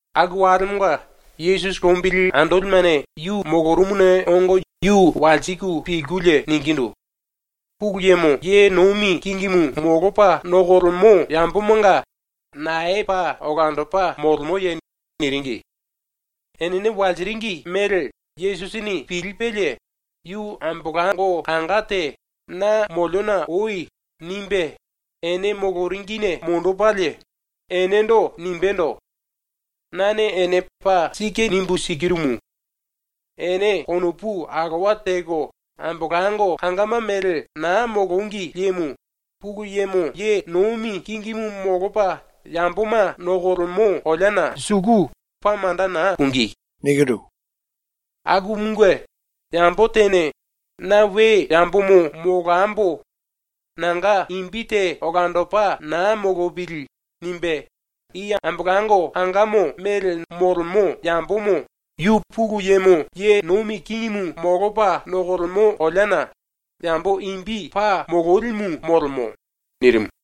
Aku walemonga Yesusi lombili andolimene yu molorumuna ongo yu walsiku pilkulie ningindu: “Pulu Yemo ye nomi kingimu molopa nokolemo yambomanga nae paa olandopa molemoye?” niringi. Enene walsiringi mele Yesusini pilipelie yu ambolango kanga te “Na moliona oi.” nimbe ene moloringine monjipelie enendo nimbendo: “Nane ene paa sike nimbu sikirumu: Ene konopu alowa teko ambolango kangama mele na molongi liemo Pulu Yemo ye nomi kingimu molopa yamboma nokolemo koleana suku paa manda na pungí. Akumunge yambo tene ‘Na we yambomo molambo. Nanga imbi te olandopa na molopili.’ nimbe i ambolango kangamo mele na molemo yambomo yu Pulu Yemo ye nomi kingimu molopa nokolemo kolea na yambo imbi paa mololimu molemo.” ⸤nirimu.⸥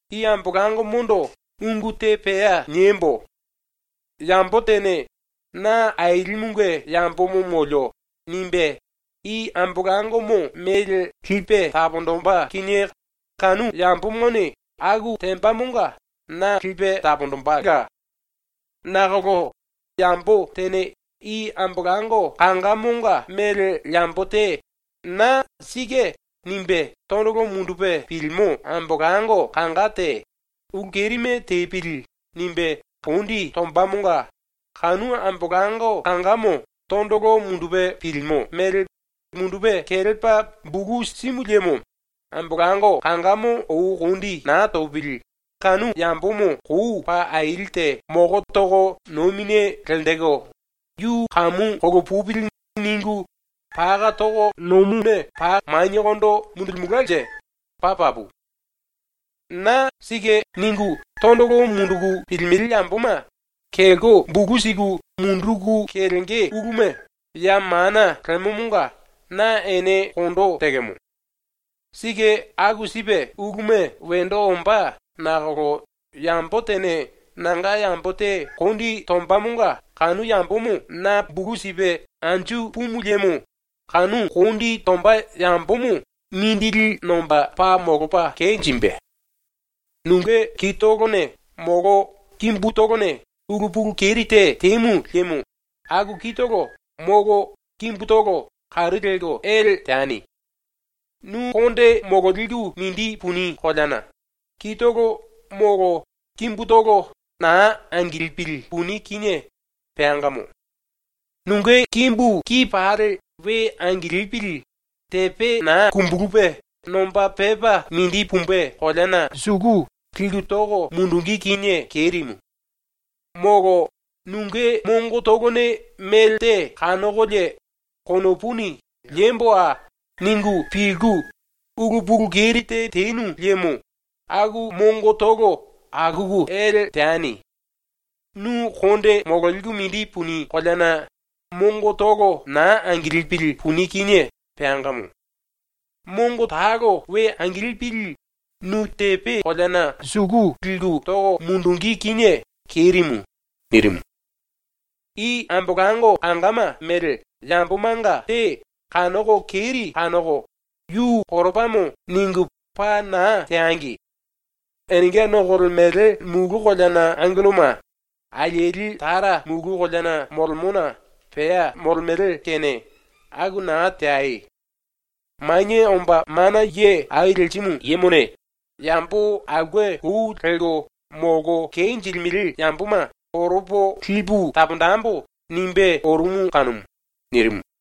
“⸤I ambolangomondo ungu te pea niembo:⸥ Yambo tene ‘Na Ailimunge yambomo molio.’ nimbe i ambolangomo mele lipe taponjimbe kinie kanu yambomone aku tembamonga na lipe taponjimbela. Nakolo yambo tene i ⸤ambolango⸥ kangamonga ⸤mele yambo⸥ te ⸤na ‘Sike’ nimbe⸥ tondolo mundupe pilimo ⸤ambolango⸥ kanga te ‘Ulu kerime tepili.’ nimbe kondi tombamonga kanu ⸤ambolango⸥ kangamo tondolo mundupe pilimo mele mundupe kelepa bulu simu liemo ⸤ambolango⸥ kangamo ou kondi na topili kou paa aili te moko toko nomine lenjiku ‘Yu kamu kolopupili.’ ningu paka toko nomuna paa maniekondo mundulimelkanje paa papu. “⸤Na⸥ ‘Sike’ ningu tondolo munduku pilimele yamboma kelko bulu siku munduku kelenge uluma ya mana lemomonga na ene kondo tekemo. Sike aku sipe uluma wendo ombá nakolo yambo tene nanga yambo te kondi tombamonga kanu yambomo na bulu sipe anju pumu liemo kanu kondi tomba yambomo mindili nomba paa molopa kenjimbe. “Nunge kitolone molo kimbutolone ulu pulu keri te temu liemo aku kitolo molo kimbutolo karu lelko ele teani. Nu konde mololiku mindi puni koleana kitolo molo kimbutolo na angilipili puni kinie peangamo. Nunge kimbu ki pali we angilipili tepe na kumbulupe nomba pepa mindi pumbe koleana liku toko mundungí kinie kerimu. Molo nunge mongotolone melte kanokolie konopuni ‘liemboa.’ ningu pilku ulu pulu keri te tenu liemo aku mongotolo akuku ele teani. Nu konde mololiku mindi puni koleana mongotolo na angilipili puni kinie peangamo. Mongo talo we angilipili nu tepe koleana suku liku toko mundungí kinie kerimu.” ⸤nirimu.⸥ “I ambolango kangama ⸤mele yamboma⸥ nga te kanoko keri kanoko ‘Yu koropamo.’ ningu paa na teangi. Enenga nokolemele mulu koleana angelloma alieli Tara mulu koleana molemona pea molemele kene ⸤aku na teai⸥. (Manie Omba Mana Ye Au Lerimu Yemone ‘Yambo aulke lou lelko molko kenjilimele yamboma koropo lipu taponjembo.’ nimbe orumu kanumu.)” ⸤nirimu.⸥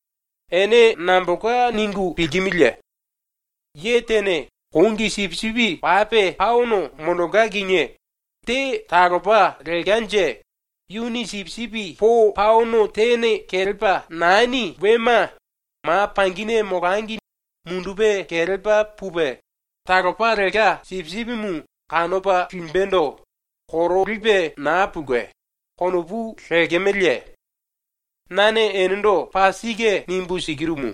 “Ene nambolka ningu pilkimiliye? ‘Ye tene kongi sipisipi pape paono monjilke kinie, te talopa lelkanje, yuni sipisipi po paono tene kelepa nani wema ma pangine molangi mundupe kelepa pupe, talopa lelka sipisipimu kanopa limbendo korolipe na pulke.’ konopu lekemeleye? Nane enendo paa sike nimbu sikirumu: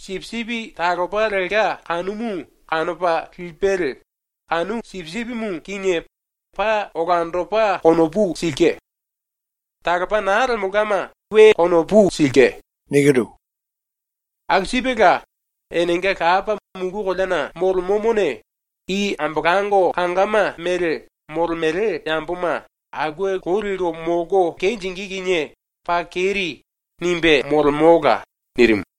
Sipisipi talopa lelka kanumu kanopa lipelie kanu sipisipimu kinie paa olandopa konopu silke. Talopa na lemelkama we konopu silke. Aku sipela enenga Lapa mulu koleana molemomone i ambolango kangama ⸤mele molemele yamboma⸥ ‘aulke lou lelko molko kenjingí kinie paa keri.’ nimbe molemola.” ⸤nirimu.⸥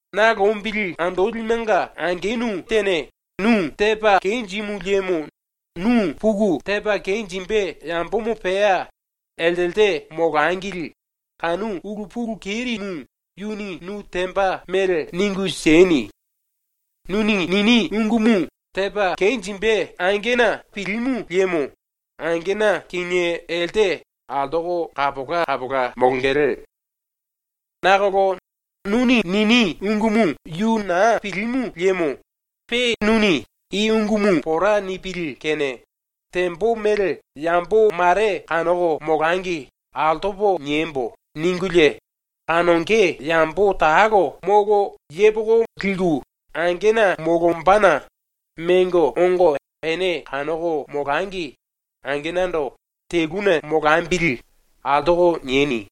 “⸤Na lombili andolimenga⸥ angenu tene nu tepa kenjimu liemo nu puku tepa kenjimbe yambomo pea eltelte molangili kanu ulu pulu kerimu yuni nu temba mele ningu sieni. Nuni nini ungumu tepa kenjimbe angena pilimu liemo angena kinie elte altoko kapola kapola molongele. Nakolo nuni nini ungumu yu na pilimu liemo pe nuni ‘I ungumu pora nipili kene tembo mele yambo mare kanoko molangi altopo niembo.’ ningulie, kanonge yambo talo molo yepoko liku angena molombana mengo ongo ene kanoko molangi angenando ‘Teluna molambili.’ altoko nieni.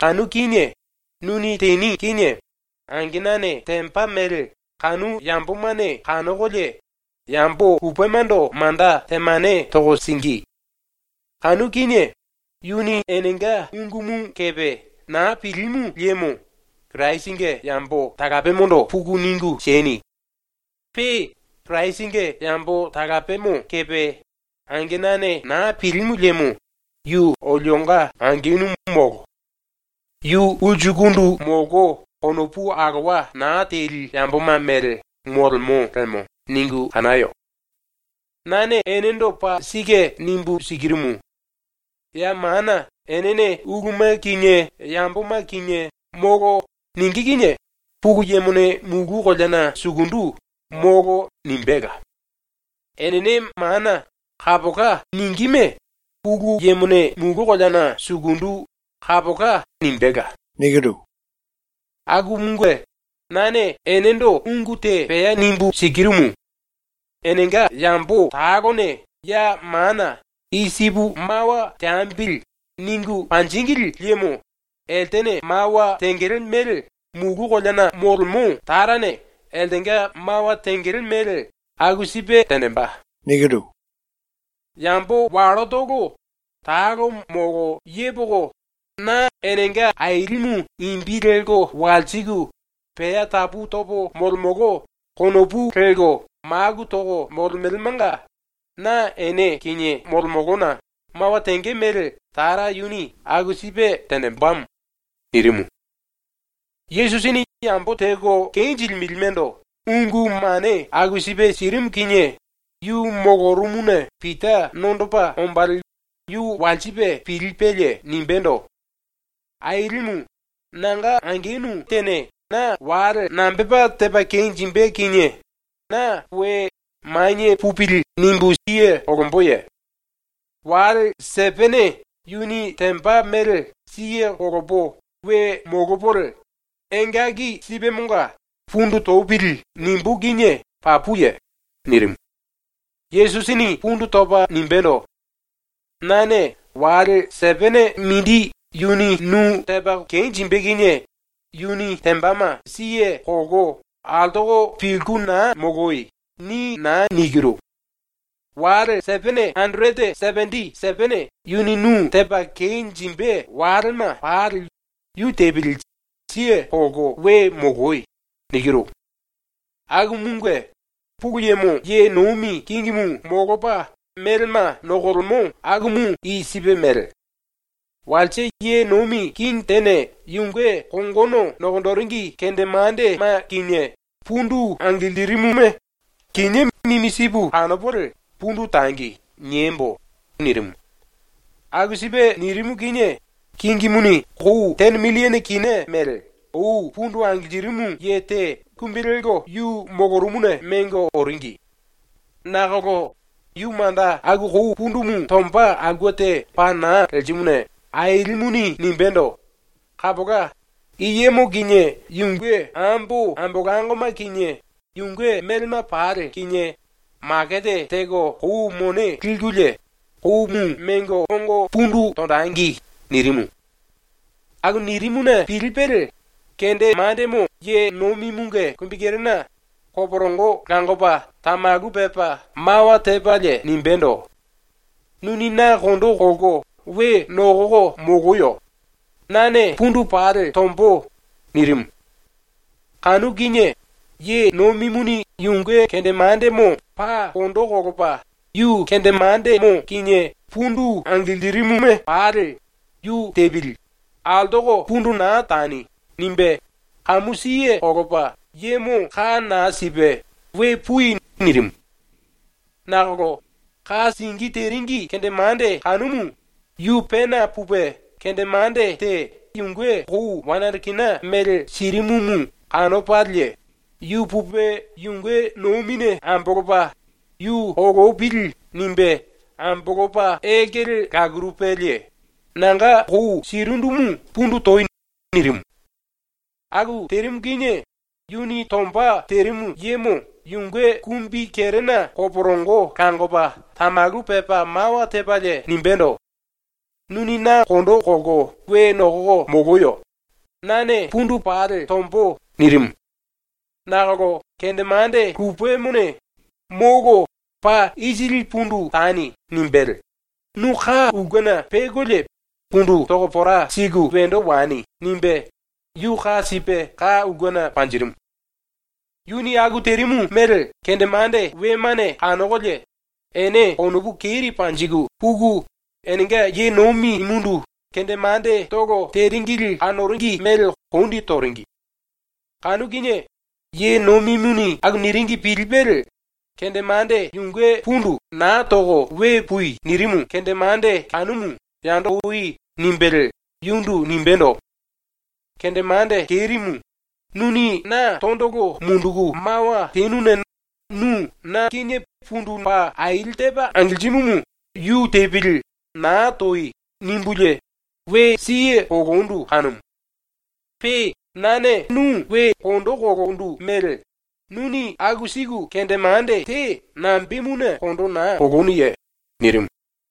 Kanu kinie nuni teni kinie angenane temba mele kanu yambomane kanokolie yambo lupemando manda temane toko singí. Kanu kinie yuni enenga ungumu kepe na pilimu liemo Kirasinge yambo talapemondo puku ningu sieni. Pe Kirasinge yambo talapemo kepe angenane na pilimu liemo ‘Yu olionga angenu molo. Yu ulsukundu molko konopu alowa na teli yamboma mele molemo lemo.’ ningu kanayo. “Nane enendo paa sike nimbu sikirumu: Ya mana enene ⸤uluma kinie yamboma kinie⸥ “Molo.” ningí kinie Pulu Yemone mulu koleana sukundu “Molo.” nimbéla; enene mana “Kapola.” ningíme Pulu Yemone mulu koleana sukundu “Kapola.” nimbéla. “⸤Akumunge⸥ nane enendo ungu te pea nimbu sikirumu: Enenga yambo talone ya mana “I sipu mawa teambili.” ningu panjíngili liemo eltene mawa tengele mele mulu koleana molemo Tarane eltenga mawa tengele mele aku sipe tenjimbe. Yambo ⸤wallotolo,⸥ talo molo yepoko, na enenga Ailimu imbi lelko walsiku, ‘Pea tapu topo molemolo.’ konopu lelko maku toko molemelemanga na ene kinie molemolona ⸤mawa tenge mele Tara yuni aku sipe tenjimbemo⸥.” nirimu. ⸤Yesusini yambo teko kenjilimelemando ungu mane aku sipe sirimu⸥ kinie yu molorumuna Pita nondopa ombalie yu walsipe pilipelie nimbendo: “Ailimu, nanga angenu tene na wale nambepa tepa kenjimbe kinie na we ‘Manie pupili.’ nimbu siye kolomboye? Wale sepene yuni temba mele siye kolopo we molopolie engaki sipemonga ‘Pundu topili.’ nimbú kinie papuye?” nirimu. Yesusini pundu topa nimbendo: “Nane “Wale sepene mindi yuni nu tepa kenjimbe kinie yuni tembama siye kolko altoko pilku na moloi.” ni na nikiru. “Wale sepene anderete sependi sepene yuni nu tepa kenjimbe walema pali yu tepili, siye kolko we moloi.” nikiru. “Akumunge Pulu Yemo ye nomi kingimu molopa melema nokolemo akumu i sipe mele: “Walse ye nomi kingi tene yunge kongono nokonjiringi kendemandema kinie pundu angilirimuma ‘ “Kinié mimi sipu kanopolie pundu tangi.” niembo.’ nirimu. Aku sipe nirimu kinie kingimuni kou tene milliene kina mele ou pundu angilirimu ye te kumbi lelko yu molorumuna mengo oringi. Nakolo yu manda aku kou pundumu tomba aulke te paa na lerimuna ailimuni nimbendo: “Kapola, i yemo kinie yunge ambo ambolangoma kinie yunge melema pali kinie makete teko kou mone likulie koumu ongo pundu tonjengi.” nirimu. Aku nirimuna pilipelie kendemandemo ye nomimunge kumbikerena koporongo langopa tamalu pepa mawa tepalie nimbendo: “Nuni na kondo kolko we nokoko moloyo. Nane pundu pali tombo.” nirimu. ⸤Kanu kinie⸥ ye nomimuni yunge kendemandemo paa kondo kolopa yu kendemandemo kinie pundu angilirimuma pali “Yu tepili. Altoko pundu na tani.” nimbe kamu siye kolopa yemo ka na sipe “We pui.” nirimu. Nakolo ⸤ka singí teringi⸥ kendemande kanumu yu pena pupe kendemande te yunge kou wane anderete kina mele sirimumu kanopalie, yu pupe yunge nomine ambolopa ‘Yu kolopili.’ nimbe ambolopa elkele lakurupelie “Nanga kou sirindumu pundu toi!” nirimu. Aku terimu kinie yuni tomba terimu yemo yunge kumbikerena koporongo langopa tamalu pepa mawa tepalie nimbendo: “Nuni na kondo kolko we nokoko moloyo. Nane pundu pali tombo.” nirimu. Nakolo kendemande lupemone “Molo, paa isili pundu tani.” nimbelie “Nu ka ulkena pekolie pundu toko pora siku wendo wani.” nimbe yu ka sipe ka ulkena panjirimu. Yuni aku terimu mele kendemande wemane kanokolie ene konopu keri panjiku puku enenga ye nomimundu kendemandetolo teringili kanoringi mele kondi toringi. Kanu kinie ye nomimuni aku niringi pilipelie kendemande yunge pundu “Naa toko we pui.” nirimu kendemande kanumu “Yando oi.” nimbelie yundu nimbendo: “Kendemande kerimu, nuni na tondolo munduku mawa tenuna nu na kinie pundu paa aili tepa angilirimumu “Yu tepili, na toi.” nimbulie we siye kolondu kanumu. Pe nane nu we kondo kolondu mele nuni aku siku kendemande te nambemuna kondo na kolonuye?” nirimu.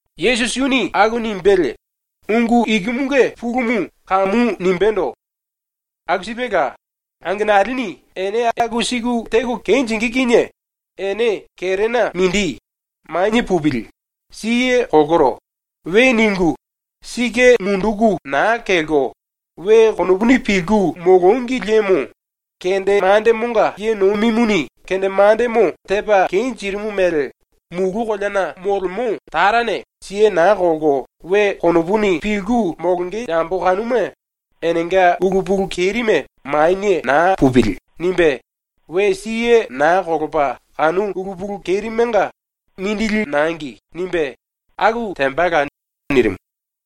⸤Yesusi yuni aku nimbelie ungu ikumunge pulumu kamu nimbendo:⸥ “Aku sipela, angenalini ene aku siku teko kenjingí kinie ene kerena mindi “Manie pupili. Siye kolkoro.” we ningu, sike munduku na kelko, we konopuni pilku molongi liemo, ⸤kendemandemonga ye nomimuni kendemandemo tepa kenjirimu mele⸥ mulu koleana molemo Tarane siye na kolko we konopuni pilku molonge yambo kanuma enenga ulu pulu kerime ‘Manie na pupili.’ nimbe, we siye na kolopa kanu ulu pulu kerimenga “Mindili nangi.” nimbe aku tembala.” nirimu.